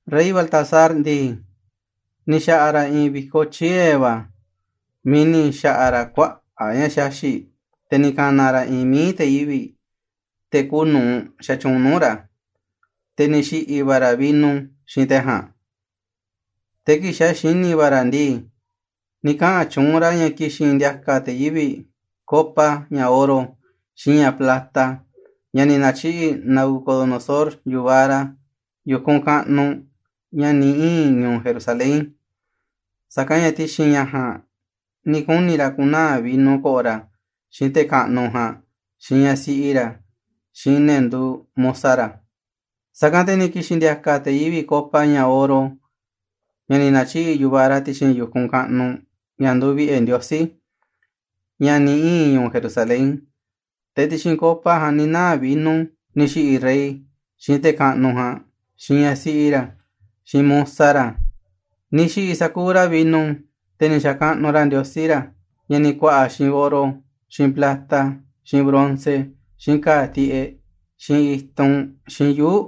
Rey Baltasar ndii, ni̱ xa̱ꞌa̱ ra̱ i̱i̱n vi̱koꞌ tyie̱ va̱ miiꞌ ni̱ xa̱ꞌa̱ ra̱ kuaꞌa̱ꞌ ña̱ xaxi̱ꞌ, te̱ ni̱ ka̱na̱ ra̱ i̱i̱n mií te̱ yivi̱ꞌ, te̱ kuuꞌ nu̱uꞌ xatyuunꞌ nuu̱ꞌ ra̱, te̱ ni̱ xi̱ꞌi̱ va̱ ra̱ vino xiinꞌ te̱ ja̱a̱nꞌ. Te̱ kii̱ꞌ xa̱ xini̱ va̱ ra̱ ndii, ni̱ kaꞌa̱n tyuunꞌ ra̱ ña̱ ki̱xi̱n ndi̱a̱ka̱ te̱ yivi̱ꞌ copa ña̱ oro, xiinꞌ ña̱ plata, ña̱ ni̱ na̱tyiꞌi̱ꞌ Nabucodonosor, yu̱vaꞌ ra̱, yu̱kunꞌ kaꞌnuꞌ, ña̱ ni̱ ii̱n ñu̱u̱ Jerusalén. Sa̱kanꞌ ña̱ ti̱xi̱n ña̱ ja̱a̱nꞌ ni̱ kuni̱ ra̱ ku̱naa̱ vino ko̱ꞌo̱ ra̱, xiinꞌ te̱ kaꞌnuꞌ ja̱a̱nꞌ, xiinꞌ ñaꞌ siꞌi ra̱, xiinꞌ ne̱ nduuꞌ musa ra̱. Sa̱kanꞌ te̱ ni̱ ki̱xi̱n ndi̱a̱ka̱ te̱ yivi̱ꞌ copa ña̱ oro, ña̱ ni̱ na̱tyiꞌi̱ꞌ yu̱vaꞌ ra̱ ti̱xi̱n yu̱kunꞌ kaꞌnuꞌ, ña̱ nduuꞌ vi̱ꞌe̱ Ndiosí, ña̱ ni̱ ii̱n ñu̱u̱ Jerusalén. Te̱ ti̱xi̱n copa ja̱a̱nꞌ ni̱ naa̱ vino ni̱ xi̱ꞌi̱ rey, xiinꞌ te̱ kaꞌnuꞌ ja̱a̱nꞌ, xiinꞌ ñaꞌ siꞌi ra̱, xiinꞌ musa ra̱. Ni̱ xi̱ꞌi̱ sa̱kuuꞌ ra̱ vino, te̱ ni̱ xa̱kaꞌnuꞌ ra̱ ndiosí ra̱, ña̱ ni̱ ku̱a̱ꞌa̱ xiinꞌ oro, xiinꞌ plata, xiinꞌ bronce, xiinꞌ ka̱a̱ tiꞌeꞌ, xiinꞌ i̱tunꞌ, xiinꞌ yuu̱ꞌ.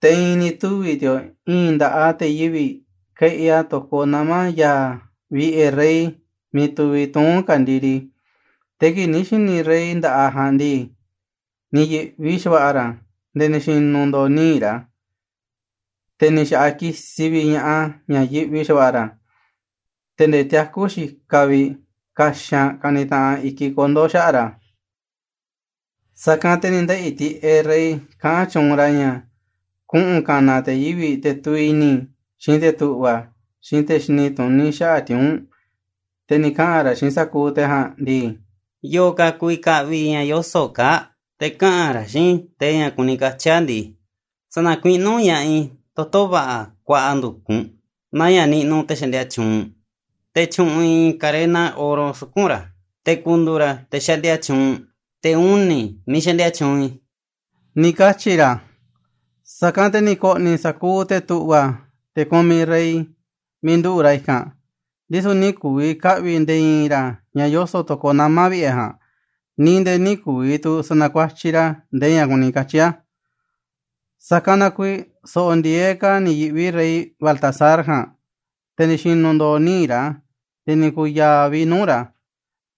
Te̱ i̱i̱n ni̱ tuvi̱ ti̱o̱ꞌ i̱i̱n nda̱ꞌaꞌ te̱ yivi̱ꞌ keꞌi a̱ to̱koꞌ nama̱ ya̱a̱ vi̱ꞌe̱ rey miiꞌ tuviꞌ tuún ka̱ndiri. Te̱ kii̱ꞌ ni̱ xi̱ni̱ rey nda̱ꞌaꞌ ja̱a̱nꞌ ndii, ni̱ yi̱ꞌvi xa̱va̱ꞌa̱ ra̱ nde̱e̱ ni̱ xi̱nu̱ ndo̱o̱ níiꞌ ra̱, te̱ ni̱ xa̱ꞌaꞌ kisiꞌ vi̱ꞌ ña̱ꞌaꞌ ña̱ yiꞌvi xava̱ꞌa̱ ra̱, te̱ nde̱e̱ tiakú xikaꞌ vi̱ꞌ kaxanꞌ kanitaꞌanꞌ i̱kiꞌ kondo̱ xaꞌa̱ꞌ ra̱. Sa̱kanꞌ te̱ ni̱ ndeꞌi̱ tiꞌeꞌ rey kaꞌán tyuunꞌ ra̱ ña̱ kuꞌu̱n ka̱na̱ te̱ yivi̱ꞌ, te̱ tuviꞌ i̱ni̱, xiinꞌ te̱ tu̱ꞌva̱, xiinꞌ te̱ xini tuní xaꞌa̱ꞌ tiuu̱nꞌ, te̱ ni̱ kaꞌa̱n ra̱ xiinꞌ sa̱kuuꞌ te̱ ja̱a̱nꞌ ndii: ―Yo̱o̱ ka̱ ku̱vi̱ ka̱ꞌvi̱ ña̱ yoso̱ꞌ kaa̱ꞌ, te̱ kaꞌa̱n ra̱ xiinꞌ i̱ ndee ña̱ kuni katyi̱ a̱ ndii, sa̱na̱kuiꞌnú ña̱ꞌaꞌ i̱ toto̱ va̱ꞌa̱ kuaꞌa ndu̱kunꞌ naa ña̱ niꞌnuꞌ te̱ xaꞌndia tyuunꞌ, te̱ tyu̱ꞌu̱n i̱ i̱i̱n karena oro suku̱nꞌ ra̱, te̱ ku̱ndu̱u̱ ra̱ te̱ xaꞌndia tyuunꞌ, te̱ uni̱, miiꞌ xaꞌndia tyuunꞌ i̱ ―ni̱ katyi̱ ra̱. Sa̱kanꞌ te̱ ni̱ ko̱ꞌni̱ sa̱kuuꞌ te̱ tu̱ꞌva̱, te̱ kumiꞌ rey, miiꞌ nduꞌu̱ꞌ ra̱ i̱kanꞌ, ndisu̱ nï̱ ku̱vi̱ ka̱ꞌvi̱ nde̱e̱ i̱i̱n ra̱ ña̱ yoso̱ꞌ to̱koꞌ nama̱ vi̱ꞌe̱ ja̱a̱nꞌ, ni̱ nde̱e̱ nï̱ ku̱vi̱ tu̱ sa̱na̱kuatyiꞌ ra̱ ndee ña̱ kuni katyi̱ a̱. Sa̱kanꞌ na kuiiꞌ so̱ꞌo̱ ndi̱e̱eꞌ ka̱ ni̱ yi̱ꞌvi rey Baltasar ja̱a̱nꞌ, te̱ ni̱ xi̱nu̱ ndo̱o̱ níiꞌ ra̱ nde̱e̱ ni̱ ku̱u̱ ya̱a̱ vi̱ꞌ nuuꞌ ra̱,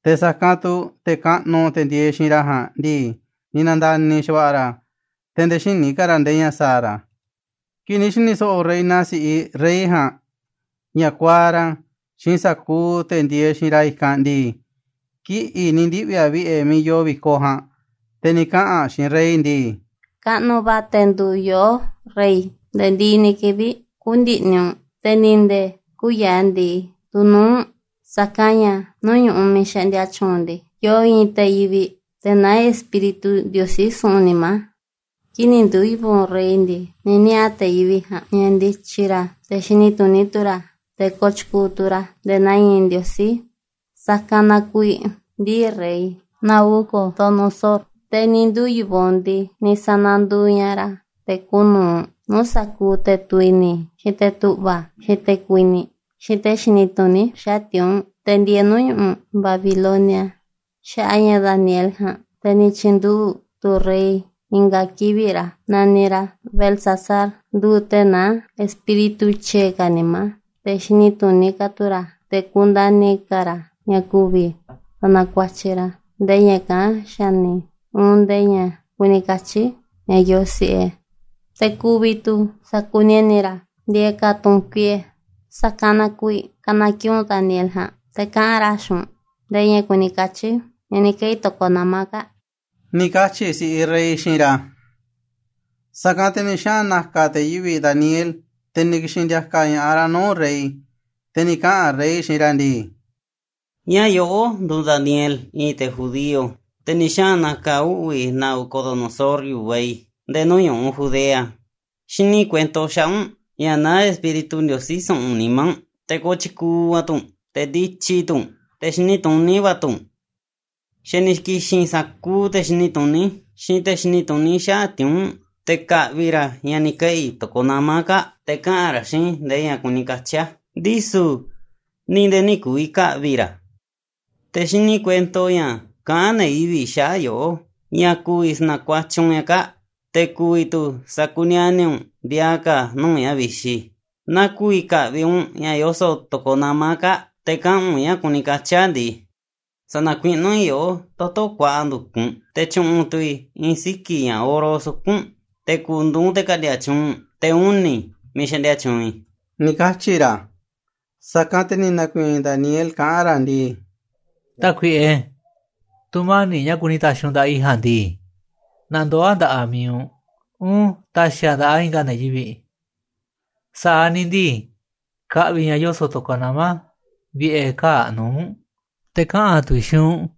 te̱ sa̱kanꞌ tu̱ te̱ kaꞌnuꞌ ndieeꞌ xiinꞌ ra̱ ja̱a̱nꞌ ndii, ni̱ na̱nda̱ni̱ xa̱va̱ꞌa̱ ra̱, te̱ nde̱e̱ xïní ka̱ ra̱ nde̱e̱ ña̱ sa̱a̱ ra̱. Kii̱ꞌ ni̱ xi̱ni̱ so̱ꞌo̱ reina si̱ꞌiꞌ rey ja̱a̱nꞌ ña̱ kuaaꞌ ra̱ xiinꞌ sa̱kuuꞌ te̱ ndieeꞌ xiinꞌ ra̱ i̱kanꞌ ndii, kiꞌi̱ꞌ ni̱ ndiꞌvi̱ aꞌ vi̱ꞌe̱ miiꞌ yoo vi̱koꞌ ja̱a̱nꞌ, te̱ ni̱ kaꞌa̱n aꞌ xiinꞌ rey ndii: ―Kaꞌnuꞌ va̱ te̱ nduuꞌ yoꞌó, rey, nde̱e̱ ndiꞌiꞌ ni̱ kivi̱ꞌ. Kü̱ndi̱ꞌni̱ u̱nꞌ, te̱ ni̱ nde̱e̱ kü̱u̱ ya̱a̱ ndi̱i tu̱ nuu̱ꞌ u̱nꞌ, sa̱kanꞌ ña̱ nuu̱ꞌ ñu̱ꞌuꞌ miiꞌ xaꞌndia tyuunꞌ u̱nꞌ ndii, yoo i̱i̱n te̱ yivi̱ꞌ, te̱ naá espíritu ndiosí su̱ꞌu̱n nimá. Kii̱ꞌ ni̱ nduu̱ yu̱vaꞌ u̱nꞌ rey ndii, ni̱ niaꞌa̱ te̱ yivi̱ꞌ ja̱a̱nꞌ ña̱ ndityi ra̱, te̱ xini tuní tu̱ ra̱, te̱ kotyukuuꞌ tu̱ ra̱ nde̱e̱ naa i̱i̱n ndiosí. Sa̱kanꞌ na kuiiꞌ ndii̱ rey Nabucodonosor, te̱ ni̱ nduu̱ yu̱vaꞌ u̱nꞌ ndii, ni̱ sa̱na̱nduuꞌ ña̱ꞌaꞌ ra̱ te̱ kuuꞌ nu̱uꞌ nuuꞌ sa̱kuuꞌ te̱ tuviꞌ i̱ni̱, xiinꞌ te̱ tu̱ꞌva̱, xiinꞌ te̱ kuini̱ꞌ, xiinꞌ te̱ xini tuní xaꞌa̱ꞌ tiuu̱nꞌ, te̱ ndieeꞌ nuu̱ꞌ ñu̱ꞌuꞌ Babilonia. Xaꞌa̱ꞌ a̱ ña̱ Daniel ja̱a̱nꞌ, te̱ ni̱ tyi̱nduꞌu̱ꞌ tu̱ rey i̱nga̱ kivi̱ꞌ ra̱ naniꞌ ra̱ Beltsasar, nduuꞌ te̱ naá espíritu tyie̱ ka̱ nimá, te̱ xini tuní ka̱ tu̱ ra̱, te̱ kundani̱ ka̱ ra̱ ña̱ ku̱vi̱ sa̱na̱kuatyiꞌ ra̱ ndee ña̱ kaꞌán xa̱ni̱, uun ndee ña̱ kuni katyi̱ ña̱ yoo si̱ꞌe, te̱ ku̱vi̱ tu̱ sakuniani̱ ra̱ ndiaa ka̱ tu̱ꞌu̱n kuiꞌe̱, sa̱kanꞌ na kuiiꞌ ka̱na̱ kiꞌi̱ꞌ u̱nꞌ Daniel ja̱a̱nꞌ, te̱ kaꞌa̱n ra̱ xiinꞌ u̱nꞌ ndee ña̱ kuni katyi̱ ña̱ ni̱ keꞌi̱ to̱koꞌ nama̱ kaa̱ꞌ ―ni̱ katyi̱ si̱ꞌiꞌ rey xiinꞌ ra̱. Sa̱kanꞌ te̱ ni̱ xaꞌa̱n na̱ka̱ te̱ yivi̱ꞌ Daniel, te̱ ni̱ ki̱xi̱n ndi̱a̱ka̱ ña̱ꞌaꞌ ra̱ nuu̱ꞌ rey. Te̱ ni̱ kaꞌa̱n rey xiinꞌ ra̱ ndii: ―¿Ñáá yoꞌó nduuꞌ Daniel, i̱i̱n te̱ judío, te̱ ni̱ xaꞌa̱n na̱ka̱ uꞌvi̱ Nabucodonosor, yu̱vaꞌ i̱, nde̱e̱ nuu̱ꞌ ñu̱ꞌuꞌ Judea? Xini i̱ kuento xaꞌa̱ꞌ u̱nꞌ ña̱ naá espíritu ndiosí su̱ꞌu̱n nimá u̱nꞌ, te̱ kotyukuuꞌ va̱ tu̱ u̱nꞌ, te̱ ndityi tu̱ u̱nꞌ, te̱ xini tuní va̱ tu̱ u̱nꞌ. Xa̱ ni̱ ki̱xi̱n sa̱kuuꞌ te̱ xini tuní, xiinꞌ te̱ xini tuní xaꞌa̱ꞌ tiuu̱nꞌ te̱ ka̱ꞌvi̱ ra̱ ña̱ ni̱ keꞌi̱ to̱koꞌ nama̱ kaa̱ꞌ, te̱ kaꞌa̱n ra̱ xiinꞌ i̱ ndee ña̱ kuni katyi̱ a̱, ndisu̱ ni̱ nde̱e̱ nï̱ ku̱vi̱ ka̱ꞌvi̱ ra̱ a̱. Te̱ xini i̱ kuento ña̱ kaꞌán ne̱ yivi̱ꞌ xaꞌa̱ꞌ yoꞌó ña̱ ku̱vi̱ sa̱na̱kuatyiꞌ u̱nꞌ ña̱ kaa̱ꞌ, te̱ ku̱vi̱ tu̱ sa̱kuniani̱ u̱nꞌ ndiaa ka̱ nuu̱ꞌ ña̱ vixi. Naaꞌ ku̱vi̱ ka̱ꞌvi̱ u̱nꞌ ña̱ yoso̱ꞌ to̱koꞌ nama̱ kaa̱ꞌ, te̱ kaꞌa̱n u̱nꞌ ña̱ kuni katyi̱ a̱ ndii, sa̱na̱kuiꞌnú i̱ yoꞌó toto̱ kuaꞌa ndu̱kunꞌ, te̱ tyu̱ꞌu̱n tu̱ i̱ i̱i̱n siki̱ ña̱ oro suku̱nꞌ u̱nꞌ, te̱ ku̱ndu̱u̱ u̱nꞌ te̱ ka̱ꞌndi̱a̱ tyuunꞌ, te̱ uni̱, miiꞌ xaꞌndia tyuunꞌ i̱ ―ni̱ katyi̱ ra̱. Sa̱kanꞌ te̱ ni̱ na̱ku̱i̱i̱n Daniel kaꞌán ra̱ ndii: ―Tákuiꞌe, tu̱mani̱ꞌ ña̱ kuni ta̱xi̱ u̱nꞌ nda̱ꞌaꞌ i̱ ja̱a̱nꞌ ndii, na ndoo̱ a̱ nda̱ꞌaꞌ mi̱iꞌ u̱nꞌ, uun ta̱xi̱ a̱ nda̱ꞌaꞌ i̱nga̱ ne̱ yivi̱ꞌ. Sa̱aꞌ ni̱ ndii, ka̱ꞌvi̱ i̱ ña̱ yoso̱ꞌ to̱koꞌ nama̱ vi̱ꞌe̱ kaa̱ꞌ nuu̱ꞌ u̱nꞌ, te̱ kaꞌa̱n tu̱ i̱ xiinꞌ u̱nꞌ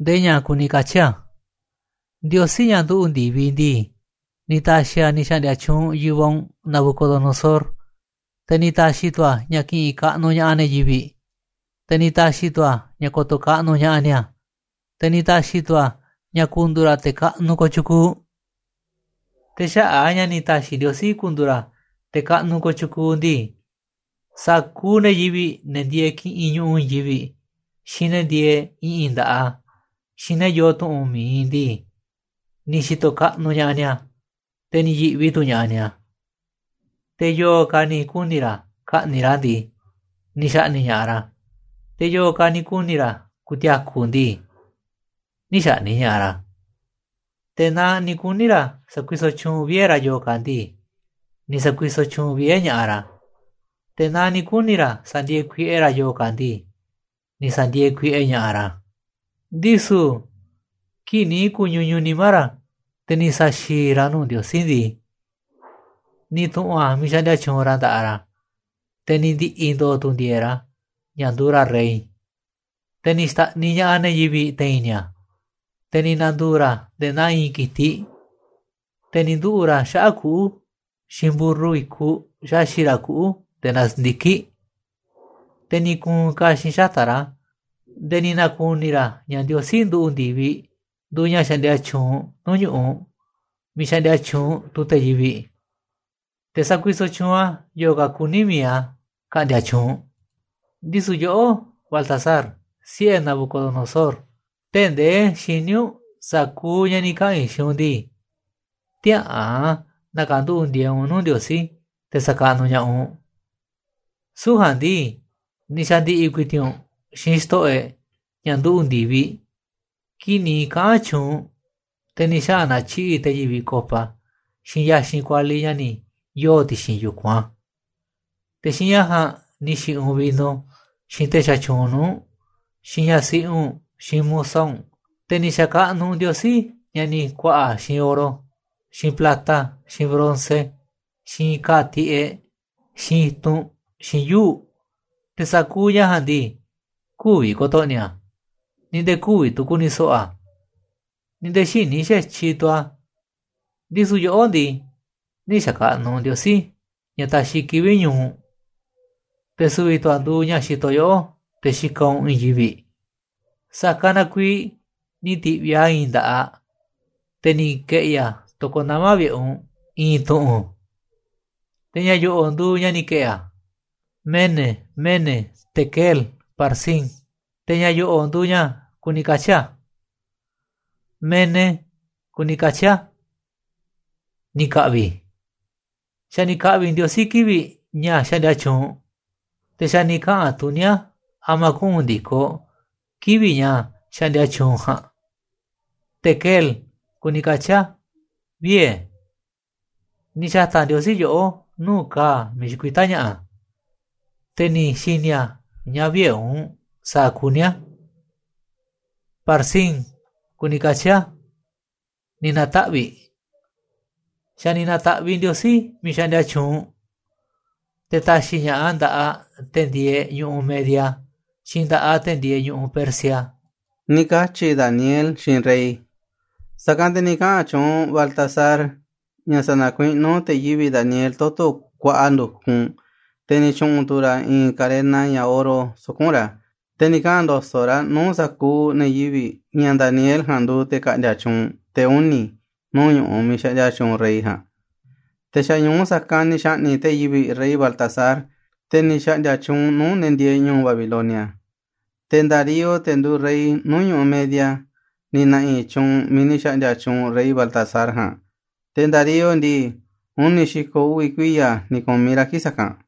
ndee ña̱ kuni katyi̱ a̱. Ndiosí, ña̱ nduꞌu̱ꞌ ndi̱viꞌ ndii, ni̱ ta̱xi̱ a̱ ni̱ xa̱ꞌndi̱a̱ tyuunꞌ yu̱vaꞌ u̱nꞌ Nabucodonosor, te̱ ni̱ ta̱xi̱ tu̱ a̱ ña̱ ki̱ꞌi̱n kaꞌnuꞌ ña̱ꞌaꞌ ne̱ yivi̱ꞌ, te̱ ni̱ ta̱xi̱ tu̱ a̱ ña̱ ko̱to̱ kaꞌnuꞌ ña̱ꞌaꞌ ni̱a̱, te̱ ni̱ ta̱xi̱ tu̱ a̱ ña̱ ku̱ndu̱u̱ ra̱ te̱ kaꞌnuꞌ kooꞌ tyukuuꞌ. Te̱ xaꞌa̱ꞌ a̱ ña̱ ni̱ ta̱xi̱ Ndiosí ku̱ndu̱u̱ ra̱ te̱ kaꞌnuꞌ kooꞌ tyukuuꞌ ndii, sa̱kuuꞌ ne̱ yivi̱ꞌ, ne̱ ndieeꞌ kiꞌinꞌ ñu̱ꞌuꞌ i̱i̱n yivi̱ꞌ, xiinꞌ ne̱ ndieeꞌ i̱ꞌi̱n nda̱ꞌaꞌ a̱, xiinꞌ ne̱ yoo tu̱ꞌu̱n mi̱iꞌ ndii, ni̱ xi̱to̱ kaꞌnuꞌ ña̱ꞌaꞌ ni̱a̱, te̱ ni̱ yi̱ꞌvi tu̱ ña̱ꞌaꞌ ni̱a̱. Te̱ yo̱o̱ ka̱ ni̱ kuni̱ ra̱ ka̱ꞌni̱ꞌ ra̱ ndii, ni̱ xa̱ꞌni̱ꞌ ña̱ꞌaꞌ ra̱, te̱ yo̱o̱ ka̱ ni̱ kuni̱ ra̱ ku̱ti̱a̱ku̱ ndii, nï̱ xa̱ꞌni̱ꞌ ña̱ꞌaꞌ ra̱. Te̱ naaꞌ ni̱ kuni̱ ra̱ sa̱kuisoꞌ tyuunꞌ vie̱ ra̱ yo̱o̱ ka̱ ndii, ni̱ sa̱kuisoꞌ tyuunꞌ vie̱ ña̱ꞌaꞌ ra̱, te̱ naaꞌ ni̱ kuni̱ ra̱ sa̱ndi̱e̱e̱ kuiꞌe ra̱ yo̱o̱ ka̱ ndii, ni̱ sa̱ndi̱e̱e̱ kuiꞌe ña̱ꞌaꞌ ra̱. Ndisu̱ kii̱ꞌ ni̱ ku̱ñuñuꞌ nimá ra̱, te̱ ni̱ sa̱xi̱i̱ ra̱ a̱ nuu̱ꞌ Ndiosí ndii, ni̱ tu̱ꞌu̱n a̱ miiꞌ xaꞌndia tyuunꞌ ra̱ nda̱ꞌaꞌ ra̱, te̱ ni̱ ndi̱ꞌi̱ ndo̱o̱ tu̱ ndi̱e̱e̱ꞌ ra̱, ña̱ nduuꞌ ra̱ rey. Te̱ ni̱ xta̱ꞌniꞌ ña̱ꞌaꞌ ne̱ yivi̱ꞌ te̱i̱n ni̱a̱, te̱ ni̱ na̱ndu̱u̱ ra̱ nde̱e̱ naa i̱i̱n ki̱tiꞌ, te̱ ni̱ nduꞌu̱ꞌ ra̱ xaꞌa̱ꞌ kuꞌu̱, xiinꞌ mburru i̱kuꞌ xaxi̱ꞌ ra̱ kuꞌu̱ nde̱e̱ naa si̱ndiki̱ꞌ, te̱ ni̱ ku̱u̱n ka̱xi̱n xata̱ꞌ ra̱ nde̱e̱ ni̱ na̱ku̱ni̱ ra̱ ña̱ Ndiosí nduꞌu̱ꞌ ndi̱viꞌ nduuꞌ ña̱ xaꞌndia tyuunꞌ nuu̱ꞌ ñu̱ꞌuꞌ miiꞌ xaꞌndia tyuunꞌ te̱ yivi̱ꞌ. Te̱ sakuisoꞌ tyuunꞌ a̱ yo̱o̱ ka̱ kuní mi̱iꞌ a̱ ka̱ꞌndi̱a̱ tyuunꞌ. Ndisu̱ yoꞌó, Baltasar, siꞌe̱ Nabucodonosor, tee̱ꞌ ndee xiní u̱nꞌ sa̱kuuꞌ ña̱ ni̱ kaꞌa̱n i̱ xiinꞌ u̱nꞌ ndii, tiäꞌa̱an na̱ka̱nduꞌu̱ꞌ ndieeꞌ u̱nꞌ nuu̱ꞌ Ndiosí te̱ sa̱kaꞌnuꞌ ña̱ꞌaꞌ u̱nꞌ. Süu̱ꞌ ja̱a̱nꞌ ndii, ni̱ xa̱ndi̱ꞌi̱ ku̱i̱ti̱ꞌ u̱nꞌ xiinꞌ xto̱ꞌo̱ e̱ꞌ, ña̱ nduꞌu̱ꞌ ndi̱viꞌ, kii̱ꞌ ni̱ kaꞌa̱n tyuunꞌ u̱nꞌ, te̱ ni̱ xaꞌa̱n na̱tyiꞌi̱ꞌ te̱ yivi̱ꞌ copa, xiinꞌ ya̱xinꞌ kualiꞌ ña̱ ni̱ yoo̱ ti̱xi̱n yu̱kunꞌ a̱, te̱ xiinꞌ ña̱ ja̱a̱nꞌ ni̱ xi̱ꞌi̱ u̱nꞌ vino, xiinꞌ te̱ xatyuunꞌ nuu̱ꞌ u̱nꞌ, xiinꞌ ñaꞌ siꞌi u̱nꞌ, xiinꞌ musa u̱nꞌ. Te̱ ni̱ xa̱kaꞌnuꞌ u̱nꞌ ndiosí ña̱ ni̱ ku̱a̱ꞌa̱ xiinꞌ oro, xiinꞌ plata, xiinꞌ bronce, xiinꞌ ka̱a̱ tiꞌeꞌ, xiinꞌ i̱tunꞌ, xiinꞌ yuu̱ꞌ, te̱ sa̱kuuꞌ ña̱ ja̱a̱nꞌ ndii, kü̱vi̱ ko̱to̱ꞌni̱ a̱, ni̱ nde̱e̱ kü̱vi̱ tu̱ ku̱ni̱ so̱ꞌo̱ a̱, ni̱ nde̱e̱ xïní xa̱tyiꞌ tu̱ a̱. Ndisu̱ yoꞌó ndii, nï̱ xa̱kaꞌnuꞌ u̱nꞌ Ndiosí, ña̱ taxiꞌ kivi̱ꞌ ñu̱u̱ u̱nꞌ, te̱ su̱vi̱ tu̱ a̱ nduuꞌ ña̱ xitoꞌ yoꞌó te̱ xikaꞌ u̱nꞌ i̱i̱n yivi̱ꞌ. Sa̱kanꞌ na kuiiꞌ ni̱ ti̱ꞌviꞌ a̱ i̱i̱n nda̱ꞌaꞌ, te̱ ni̱ ke̱ꞌi̱ a̱ to̱koꞌ nama̱ vi̱ꞌe̱ u̱nꞌ, i̱i̱n tu̱ꞌu̱n. Te̱ ña̱ yo̱ꞌo̱ꞌ nduuꞌ ña̱ ni̱ ke̱ꞌi̱ a̱, MENE, MENE, TEKEL, PARSIN. Te̱ ña̱ yo̱ꞌo̱ꞌ nduuꞌ ña̱ kuni katyi̱ a̱. MENE kuni katyi̱ a̱: Ni̱ ka̱ꞌvi̱. Xa̱ ni̱ ka̱ꞌvi̱ Ndiosí kivi̱ꞌ ña̱ xaꞌndia tyuunꞌ u̱nꞌ, te̱ xa̱ ni̱ kaꞌa̱n tuní a̱ a̱ma̱ kuꞌu̱n ndi̱koꞌ kivi̱ꞌ ña̱ xaꞌndia tyuunꞌ u̱nꞌ ja̱a̱nꞌ. TEKEL kuni katyi̱ a̱: Vie̱. Ni̱ xa̱ta̱ Ndiosí yoꞌó nuu̱ꞌ ka̱a̱ miiꞌ xikuitá ña̱ꞌa̱, te̱ ni̱ xi̱ni̱ a̱ ña̱ vïe̱ u̱nꞌ sa̱a̱ kuní a̱. PARSIN kuni katyi̱ a̱: Ni̱ na̱taꞌvi̱ꞌ. Xa̱ ni̱ na̱ta̱ꞌviꞌ Ndiosí miiꞌ xaꞌndia tyuunꞌ u̱nꞌ, te̱ ta̱xi̱ ña̱ꞌaꞌ a̱ nda̱ꞌaꞌ te̱ ndieeꞌ ñu̱ꞌuꞌ Media, xiinꞌ nda̱ꞌaꞌ te̱ ndieeꞌ ñu̱ꞌuꞌ Persia ―ni̱ katyi̱ Daniel xiinꞌ rey. Sa̱kanꞌ te̱ ni̱ kaꞌa̱n tyuunꞌ Baltasar ña̱ sa̱na̱kuiꞌnú te̱ yivi̱ꞌ Daniel toto̱ kuaꞌa ndu̱kunꞌ, te̱ ni̱ tyu̱ꞌu̱n tu̱ ra̱ i̱i̱n karena, ña̱ oro, suku̱nꞌ ra̱. Te̱ ni̱ kaꞌa̱n ndo̱so̱ꞌ ra̱ nuu̱ꞌ sa̱kuuꞌ ne̱ yivi̱ꞌ ña̱ Daniel ja̱a̱nꞌ nduuꞌ te̱ ka̱ꞌndi̱a̱ tyuunꞌ, te̱ uni̱, nuu̱ꞌ ñu̱ꞌuꞌ miiꞌ xaꞌndia tyuunꞌ rey ja̱a̱nꞌ. Te̱ xa̱ ñu̱u sa̱kanꞌ ni̱ xa̱ꞌni̱ꞌ te̱ yivi̱ꞌ rey Baltasar, te̱ ni̱ xa̱ꞌndi̱a̱ tyuunꞌ nuu̱ꞌ ne̱ ndieeꞌ ñu̱u̱ Babilonia. Te̱ Darío, te̱ nduuꞌ rey nuu̱ꞌ ñu̱ꞌuꞌ Media, ni̱ na̱ꞌi̱ tyuunꞌ miiꞌ ni̱ xa̱ꞌndi̱a̱ tyuunꞌ rey Baltasar ja̱a̱nꞌ, te̱ Darío ndii, uni̱ xi̱ko̱ uvi̱ kuiya̱ ni̱ ku̱miꞌ ra̱ kii̱ꞌ sa̱kanꞌ.